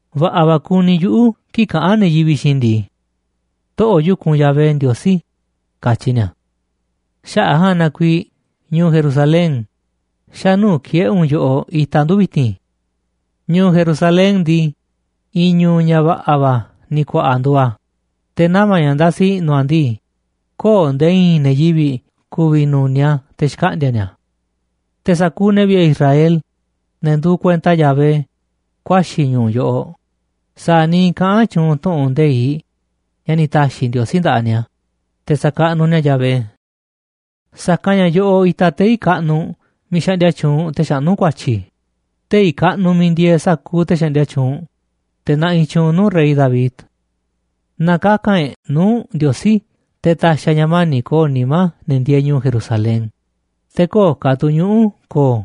Va̱ꞌa̱ va̱ kuni yuꞌu̱ kii̱ꞌ kaꞌán ne̱ yivi̱ꞌ xiinꞌ i̱ ndii: “Toꞌo̱ꞌ yu̱kunꞌ Yahvé Ndiosí”, katyi ni̱a̱. Xaꞌa̱ꞌ a̱ ja̱a̱nꞌ na kuiiꞌ ñu̱u̱ Jerusalén, xa̱ nuu̱ꞌ ki̱e̱ꞌe̱ u̱nꞌ yoꞌoꞌ itaꞌ ndu̱ vi̱ti̱n. Ñu̱u̱ Jerusalén ndii, i̱i̱n ñu̱u̱ ña̱ va̱ꞌa̱ va̱ ni̱ ku̱a̱ꞌa̱ nduuꞌ a̱, te̱ nama̱ ña̱ ndasi i̱ꞌnu̱ a̱ ndii, köo̱ꞌ nde̱e̱ i̱i̱n ne̱ yivi̱ꞌ ku̱vi̱ nu̱niaꞌ a̱ te̱ xkaꞌndi̱a̱ ni̱a̱. Te̱ sa̱kuuꞌ ne̱ vi̱ꞌe̱ Israel, ne̱ nduuꞌ kuenta Yahvé, ku̱a̱xi̱ ñu̱u̱ yoꞌoꞌ, sa̱a̱ niiꞌ kaꞌán tyuunꞌ tu̱ꞌu̱n nde̱iꞌ ña̱ ni̱ ta̱xi̱ Ndiosí nda̱ꞌaꞌ ni̱a̱, te̱ sa̱kaꞌnuꞌ ni̱a̱ Yahvé. Sa̱kanꞌ ña̱ yoꞌoꞌ itaꞌ tei̱ kaꞌnuꞌ miiꞌ xaꞌndia tyuunꞌ te̱ xaꞌnú ku̱a̱tyi̱, tei̱ kaꞌnuꞌ miiꞌ ndieeꞌ sa̱kuuꞌ te̱ xaꞌndia tyuunꞌ, te̱ naꞌiꞌ tyuunꞌ nuu̱ꞌ rey David. Na kaka̱n e̱ꞌ nuu̱ꞌ Ndiosí te̱ ta̱xi̱ a̱ ña̱ mani̱ꞌ ko̱o̱ nimá ne̱ ndieeꞌ ñu̱u̱ Jerusalén, te̱ köo̱ꞌ ka̱ tu̱ ñuꞌu̱ ko̱o̱,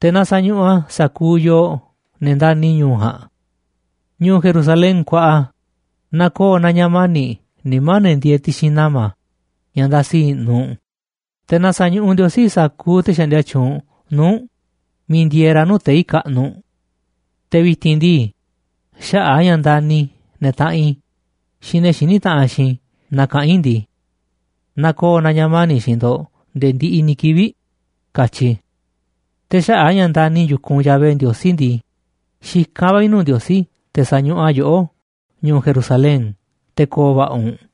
te̱ na sa̱ñuꞌuꞌ a̱ sa̱kuuꞌ yoo, ne̱ ndani̱ ñu̱u̱ ja̱a̱nꞌ. Ñu̱u̱ Jerusalén kuaꞌa, na ko̱o̱ na ña̱ mani̱ꞌ nimá ne̱ ndieeꞌ ti̱xi̱n nama̱ ña̱ ndasiꞌ i̱ꞌnu̱ u̱nꞌ, te̱ na sa̱ñuꞌuꞌ Ndiosí sa̱kuuꞌ te̱ xaꞌndia tyuunꞌ nuu̱ꞌ u̱nꞌ miiꞌ ndieeꞌ ra̱ nuu̱ꞌ tei̱ kaꞌnuꞌ. Te̱ vi̱ti̱n ndii, xaꞌa̱ꞌ a̱ ña̱ ndani̱ i̱ ne̱ taꞌanꞌ i̱ xiinꞌ ne̱ xiní taꞌanꞌ xiinꞌ i̱, na kaꞌán i̱ ndii: “Na ko̱o̱ na ña̱ mani̱ꞌ xiinꞌ ndo̱ꞌ nde̱e̱ ndiꞌiꞌ ni̱ kivi̱ꞌ”, katyi i̱. Te̱ xaꞌa̱ꞌ a̱ ña̱ ndani̱ i̱ yu̱kunꞌ Yahvé Ndiosí ndii, xikán va̱ i̱ nuu̱ꞌ Ndiosí te̱ sa̱ñuꞌuꞌ a̱ yoꞌó, ñu̱u̱ Jerusalén, te̱ ko̱o̱ va̱ꞌa̱ u̱nꞌ.